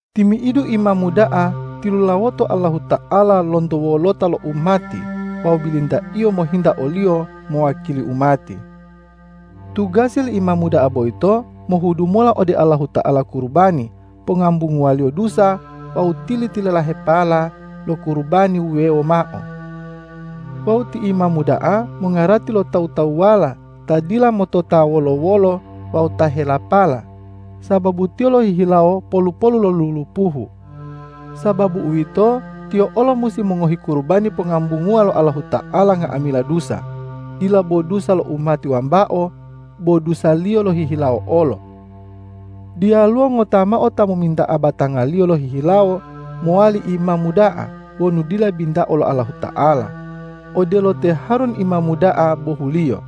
Timi'idu imamu da'a tilulawoto Allahuta'ala lonto wolota lo umati wawu bilinta-Iyo mohinta o-Liyo mowakili umati. Tugasi li imamu da'a boyito mohudu mola ode Allahuta'ala kurubani pongambunguwa-Liyo dusa wawu tili-tililahepala lo kurubani wuwewo mao. Wawu ti imamu da'a mongarati lo tawu-tawuwala ta dila motota wolo-wolo wawu ta helapala, sababu tiyo lohihilawo polu-polu lo lulupuhu. Sababu uwito, tiyo olo musi mongohi kurubani pongambunguwa lo Allahuta'ala nga'amila dusa, dila bo dusa lo umati wambao, bo dusaliyo lohihilawo olo. Diyaluwo ngota mao ta mominta'a batangaliyo lohihilawo mowali imamu da'a wonu dila bintao lo Allahuta'ala, odelo te Harun imamu da'a bohuliyo.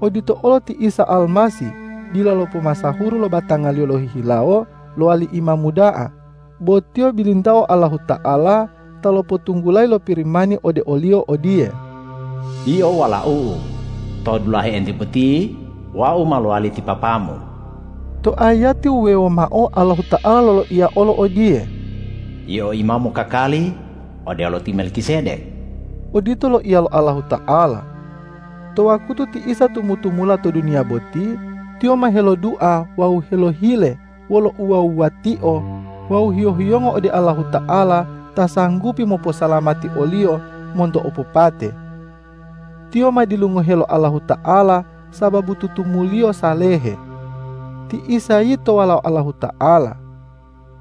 Odito olo ti Isa Almasih dila lopomasahuru lo batanga-Liyo lohihilawo lowali Imamu da'a, bo Tiyo bilintao Allahuta'ala ta lopotunggulayi lo Pirimani ode o-Liyo odiye,”Yio Walau-U, to dulahe entiye boti Wau ma lowali ti Papa-Mu.” To ayati wuwewo mao Allahuta'ala loloiya olo odiye,”Yio Imamu kakali odelo te Melkisedek.” Odito loiya lo Allahuta'ala. To wakutu ti Isa tumu-tumula to duniya boti, Tiyo ma helodua wawu helohile wolo uwuwa-wuwatio wawu hiyo-hiyongo ode Allahuta'ala ta sanggupi moposalamati o-Liyo monto opopate. Tiyo ma dilungohe lo Allahuta'ala sababu tutumu-Liyo salehe. Ti Isa yito Walao Allahuta'ala.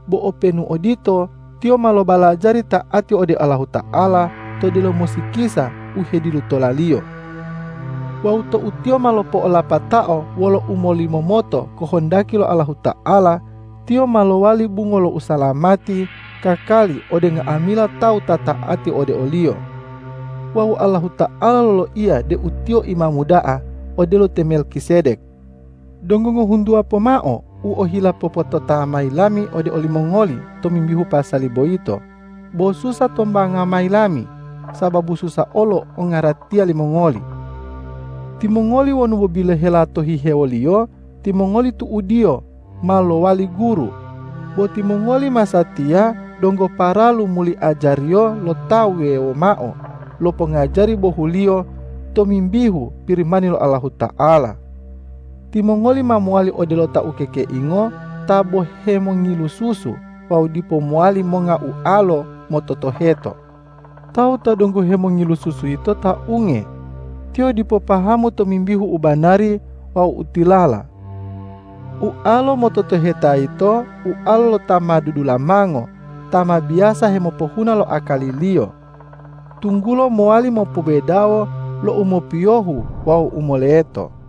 Bo openu odito, Tiyo ma lobalajari ta'ati ode Allahuta'ala to delomo sikisa u hedilutola-Liyo. Wawu tou Tiyo ma lopo'olapatao wolo umolimomoto kohondaki lo Allahuta'ala, Tiyo ma lowali bungo lo usalamati kakali ode nga'amila tawu ta ta'ati ode o-Liyo. Wawu Allahuta'ala loloiya deu Tiyo Imamu da'a odelo te Melkisedek. Donggo ngohuntuwa pomao u ohila popotota mayi lami ode olimongoli tomimbihu pasali boyito, bo susa tombanga mayi lami, sababu susa olo ongaratiya limongoli. Timongoli wonu bo bilohela to hihewoliyo, timongoli tu'udiyo ma lowali guru, bo timongoli masatiya donggo paralu muli ajariyo lo tawu wuwewo mao lo pongajari bohuliyo tomimbihu Pirimani lo Allahuta'ala. Timongoli ma mowali odelo ta ukekeingo ta bo hemongilu susu wawu dipo mowali monga ualo mototoheto. Tawu ta donggo hemongilu susu yito ta unge; tiyo dipo pahamu tomimbihu u banari wawu u tilala. Ualo mototoheta yito ualo lo ta ma dudulamango ta ma biyasa hemopohuna lo akaliliyo, tunggulo mowali mopobedawo lo u mopiyohu wawu u moleto.